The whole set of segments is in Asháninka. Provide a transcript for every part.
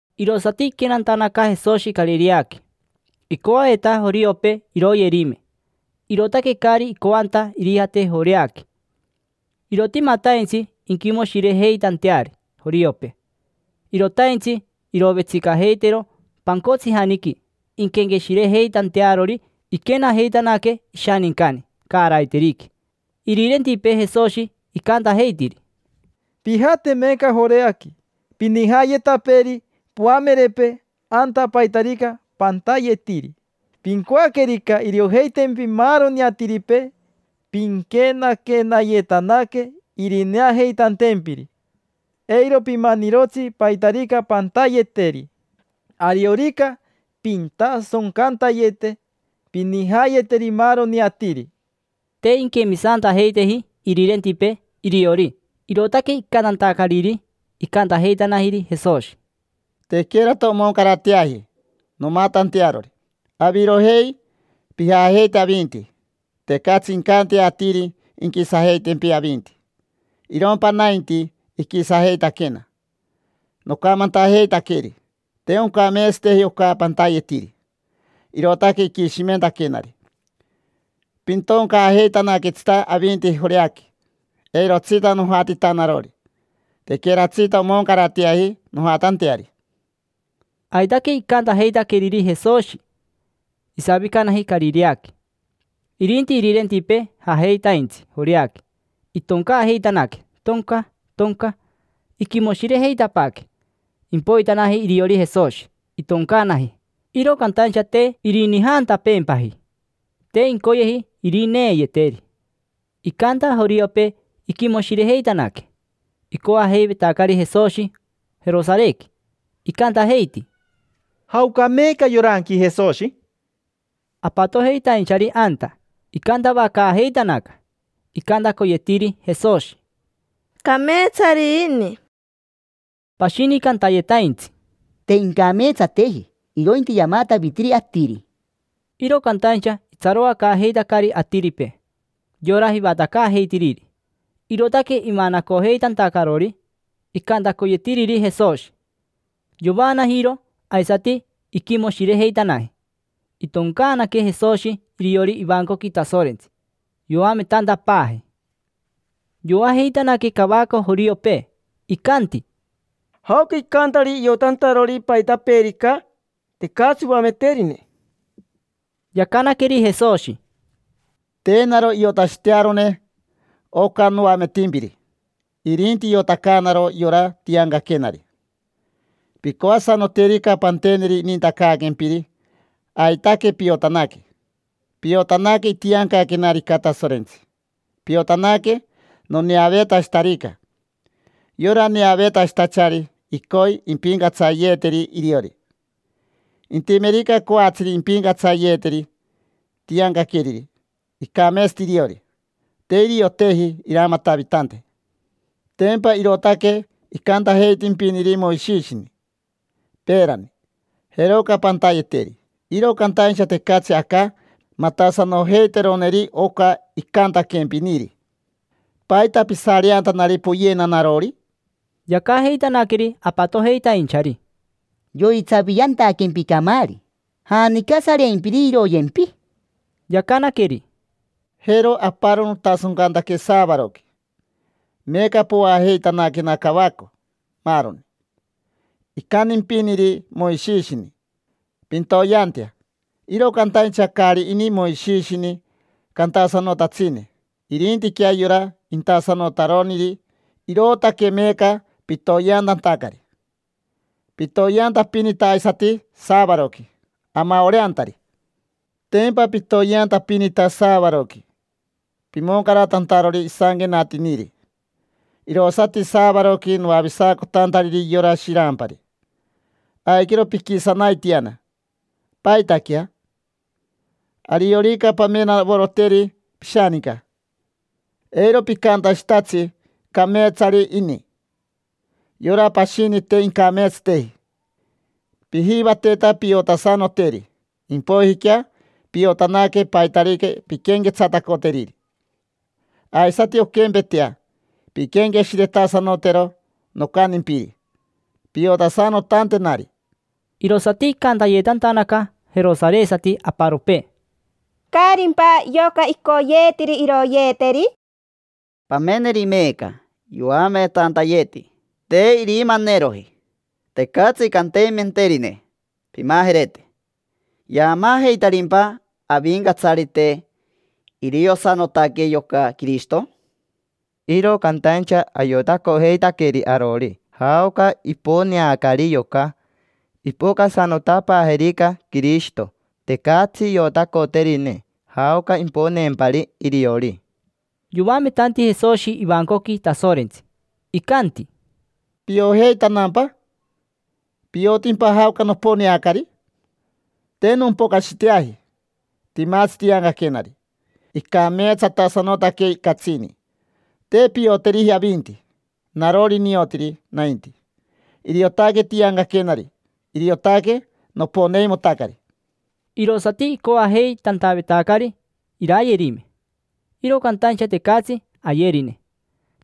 Irosati iquenantanaca Jesoshi Carireaqui. Icoaveta joriopee iroyerime, irootaque caari icoanta irijate Joreaqui. Irotimataintsi inquimoshirejeitanteari joriopee. Irotaintsi irovetsicajeitero pancotsijaniqui inquenqueshirejeitantearori iquenajeitanaque ishanincani caaraiteriqui. Irirentipee Jesoshi icantajeitiri: —Pijate meeca Joreaqui. Pinijaayetapeeri poamerepee anta paitarica pantayetiri. Pincoaquerica iriojeitempi maaroni atiripee pinquenaquenayetanaque irineajeitantempiri. Eiro pimanirotsi paitarica pantayeteri. Ariorica pintasoncantayete, pinijaayeteri maaroni atiri. Te inquemisantajeiteji irirentipee iriori, irootaque icantantacariri. Icantajeitanajiri Jesoshi: —Tequerata omoncarateaji nomatantearori. Avirojei, pijajeite avinti. Tecatsi incantea atiri inquisajeitempi avinti. Irompa nainti, iquisajeitaquena. Nocamantajeitaqueri: “Te oncameetsateji oca pantayetiri”, irootaque iquishimentaquenari. Pintoncaajeitanaquetsita avinti Joreaqui. Eirotsita nojatita narori, tequeratsita omoncarateaji nojatanteari. Aitaque icantajeitaqueriri Jesoshi. Isavicanaji Carireaqui. Irinti irirentipee jajeitaintsi Joreaqui, itoncaajeitanaque, tonca, tonca. Iquimoshirejeitapaaque. Impoitanaji iriori Jesoshi, itoncaanaji, iro cantaincha te irinijaantapeempaji: te incoyeji irineeyeteri. Icanta joriopee iquimoshirejeitanaque. Icoajeivetacari Jesoshi Jerosarequi, icantajeiti: —¿Jaoca meeca yoranqui Jesoshi? Apatojeitainchari anta icantavacaajeitanaca. Icantacoyetiri Jesoshi: —Cameetsari ini. Pashini cantayetaintsi: —Te incameetsateji, irointi yamatavitiri atiri. Iro cantaincha itsaroacaajeitacari atiripee yora jivatacaajeitiriri, irootaque imanacojeitantacarori icantacoyetiriri Jesoshi. Yovaanajiro aisati iquimoshirejeitanaji. Itoncaanaque Jesoshi iriori ivancoqui Tasorentsi, yoametantapaaji. Yoajeitanaque cavaco joriopee. Icanti: —¿Jaoca icantari iotantarori paitapeerica? Tecatsi oameterine. Yacanaqueri Jesoshi: —Te naro iotashitearone oca noametimpiri, irinti iotacaanaro yora tiancaquenari. Pincoasanoterica panteneri inintacaaquempiri, aitaque piotanaque. Piotanaque itiancaquenarica Tasorentsi. Piotanaque noneaveetashitarica. Yora neaveetashitachari icoi impincatsayeeyeteri iriori. Intimerica coatsiri impincatsayeeyeteri tiancaqueriri, icameetsati iriori; te irioteji iramatavitante. Tempa irootaque icantajeitimpiniri Moishishini peerani: “Jeroca pantayeteri”. Iro cantaincha tecatsi aca matasanojeiteroneri oca icantaquempiniri. ¿Paita pisareantanari poyena narori? Yacajeitanaqueri apatojeitainchari: —Yoitsaviantaquempi camaari. ¿Janica sareimpiri iroyempi? Yacanaqueri: —Jero aparo notasoncantaque saavaroqui, meeca poajeitanaquena cavaco maaroni. Icantimpiniri Moishishini: “Pintoyeantea”. Iro cantaincha caari ini Moishishini cantasanotatsine, irintiquea yora intasanotaroniri. Irootaque meeca pitoyeantantacari. Pitoyeantapinita aisati saavaroqui amaoreantari. Tempa pitoyeantapinita saavaroqui, pimoncaratantarori isanquenatiniri. Irosati saavaroqui noavisacotantariri yora shirampari. Aiquero piquisanaitiana. ¿Paitaquea? Ariorica pamenavoroteri pishaninca, eiro picantashitatsi: “Cameetsari ini. Yora pashini te incameetsateji”. Pijivateta piotasanoteri, impoijiquea piotanaque paitarica pinquenquetsatacoteriri. Aisati onquempetea, pinquenqueshiretasanotero nocantimpiri piotasanotantenari. Irosati icantayetantanaca jerosaresati aparopee: —¿Caarimpa yoca icoyeetiri iroyeeteri? Pameneri meeca, yoametantayeti, te irimaneroji. Tecatsi cantimenterine: “Pimajerete”. ¿Yaamaajeitarimpa avincatsarite iriosanotaque yoca Quirishito? Iro cantaincha ayotacojeitaqueri arori jaoca iponeacari yoca. Impocasanotapaajerica Quirishito, tecatsi iotacoterine jaoca imponeempari iriori. Yoametanti Jesoshi ivancoqui Tasorentsi, icanti: —¿Piojeitanampa? ¿Piotimpa jaoca noponeacari? Te nompocashiteaji, timatsi tiancaquenari: icameetsatasanotaque catsini. Te pioteriji avinti, narori niotiri nainti. Iriotaque tiancaquenari, iriotaque noponeimotacari. Irosati icoajeitantavetacari iraayerime. Iro cantaincha tecatsi ayerine.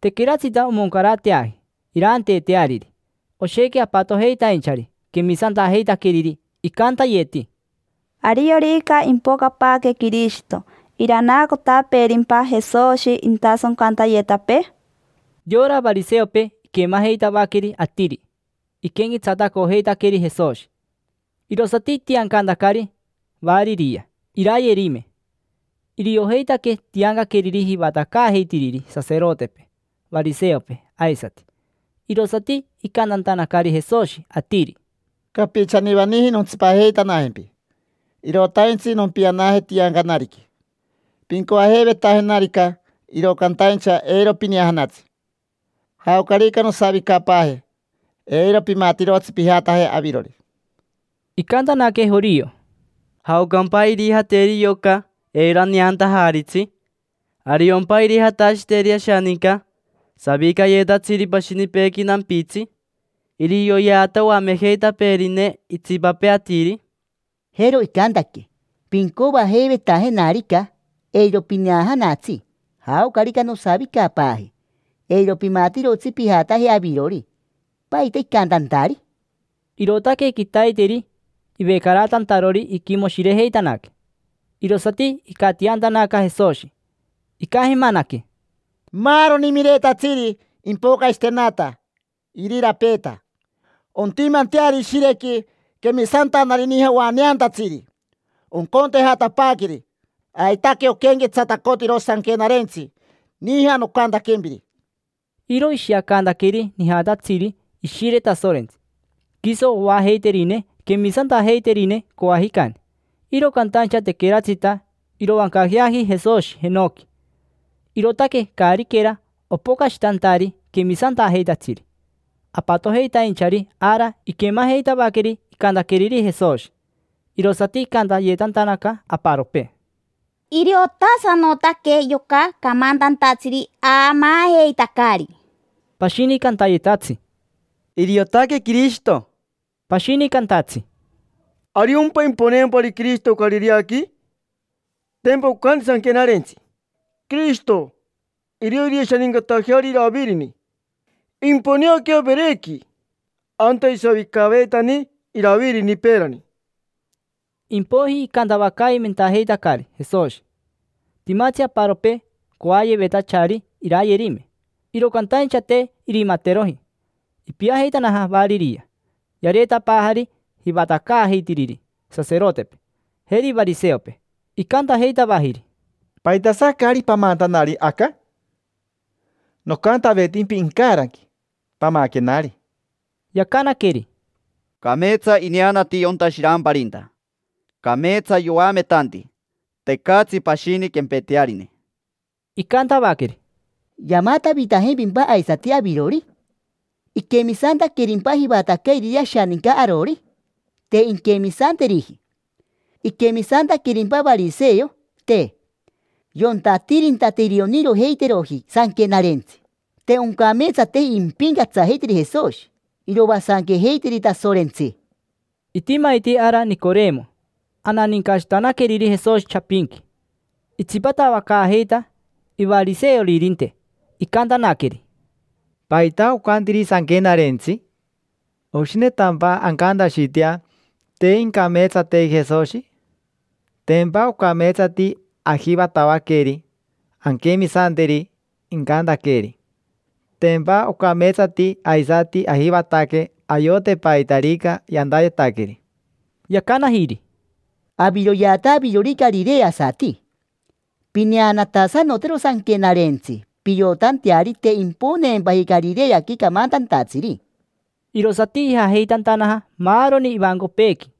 Tequeratsita omoncarateaji iraanteeteariri. Oshequi apatojeitainchari quemisantajeitaqueriri. Icantayeti: —¿Ariorica impocapaaque Quirishito, iranaacotapeerimpa Jesoshi intasoncantayetapee? Yora variseopee iquemajeitavaqueri atiri iquenquetsatacojeitaqueri Jesoshi. Irosati itiancantacari variria iraayerime. Iriojeitaque tiancaqueriri jivatacaajeitiriri saserotepee, variseopee aisati. Irosati icantantanacari Jesoshi atiri: —Capichanivaniji nontsipajeitanajempi. Irotanaintsi nompianaje tiancanariqui. Pincoajeivetajenarica, iro cantaincha eiro pineajanatsi. Jaocarica nosavicapaaje eiro pimatirotsi pijataje avirori. Icantanaque jorio: —¿Jaocampa irijateri yoca eiro aneantajaritsi? ¿Ariompa irijatashiteri ashaninca savicayetatsiri pashinipeequi nampitsi? Irioyeata oamejeitapeerine itsipapee atiri. Jero icantaque: “Pincoajeivetajenarica eiro pineajanatsi. Jaocarica nosavicapaaje eiro pimatirotsi pijataje avirori”. ¿Paita icantantari? Irootaque quitaiteri ivecaratantarori iquimoshirejeitanaque. Irosati icatiantanaca Jesoshi. Icajemanaque: —Maaroni miretatsiri impocashitenata irirapeeta, ontimanteari ishirequi quemisantanari nija oaneantatsiri, oncontejatapaaqueri. Aitaque oquenquetsatacotiro Sanquenarentsi nija nocantaquempiri. Iro ishiacantaqueri nijatatsiri Ishire Tasorentsi, quiso oajeiterine quemisantajeiterine corajicani. Iro cantaincha tequeratsita iroancajeaji Jesoshi jenoqui, irootaque caariquera opocashitantari quemisantajeitatsiri. Apatojeitainchari ara iquemajeitavaqueri icantaqueriri Jesoshi, irosati icantayetantanaca aparopee: —Iriotasanotaque yoca camantantatsiri aamaajeitacari. Pashini cantayetatsi: —Iriotaque Quirishito. Pashini cantatsi: —¿Ariompa imponeempari Quirishito Carireaqui? Tempa ocanti Sanquenarentsi: “Quirishito irio irishanincatajeari Iravirini. Imponeaquea Verequi, anta isavicaveitani Iravirini peerani”. Impoiji icantavacaimentajeitacari Jesoshi. Timatsi aparopee coayevetachari irayerime, iro cantaincha te irimateroji. Ipiajeitanaja variria. Yareetapaajari jivatacaajeitiriri saserotepee, jeri variseopee. Icantajeitavajiri: —¿Paitasa caari pamantanari aca? Nocantavetimpi incaranqui: “Pamaquenari”. Yacanaqueri: —Cameetsa ineanati yonta shiramparinta. Cameetsa yoametanti, tecatsi pashini quempetearine. Icantavaqueri: —¿Yamatavitajimpimpa aisati avirori? ¿Iquemisantaquerimpa jivatacairiri ashaninca arori? Te inquemisanteriji. ¿Iquemisantaquerimpa variseo? Te. Yonta atirinta te irionirojeiteroji Sanquenarentsi. Te oncameetsateji impincatsajeiteri Jesoshi: iroasanquejeiteri Tasorentsi. Itimaiti ara Nicoremo, ananincashitanaqueriri Jesoshi chapinqui. Itsipatavacaajeita ivariseoririnte, icantanaqueri: —¿Paita ocantiri Sanquenarentsi? ¿Oshinetantampa ancantashitea: “Te incameetsateji Jesoshi”? Tempa ocameetsati ajivatavaqueri anquemisanteri incantaqueeri. Tempa ocameetsati aisati ajivataque ayote paitarica yantayetaqueri. Yacanajiri: —Aviroyeata avirori carireasati. Pineanatasanotero Sanquenarentsi piotanteari te imponeempaji Carireaqui camantantatsiri. Irosati ijajeitantanaja maaroni ivancopeequi.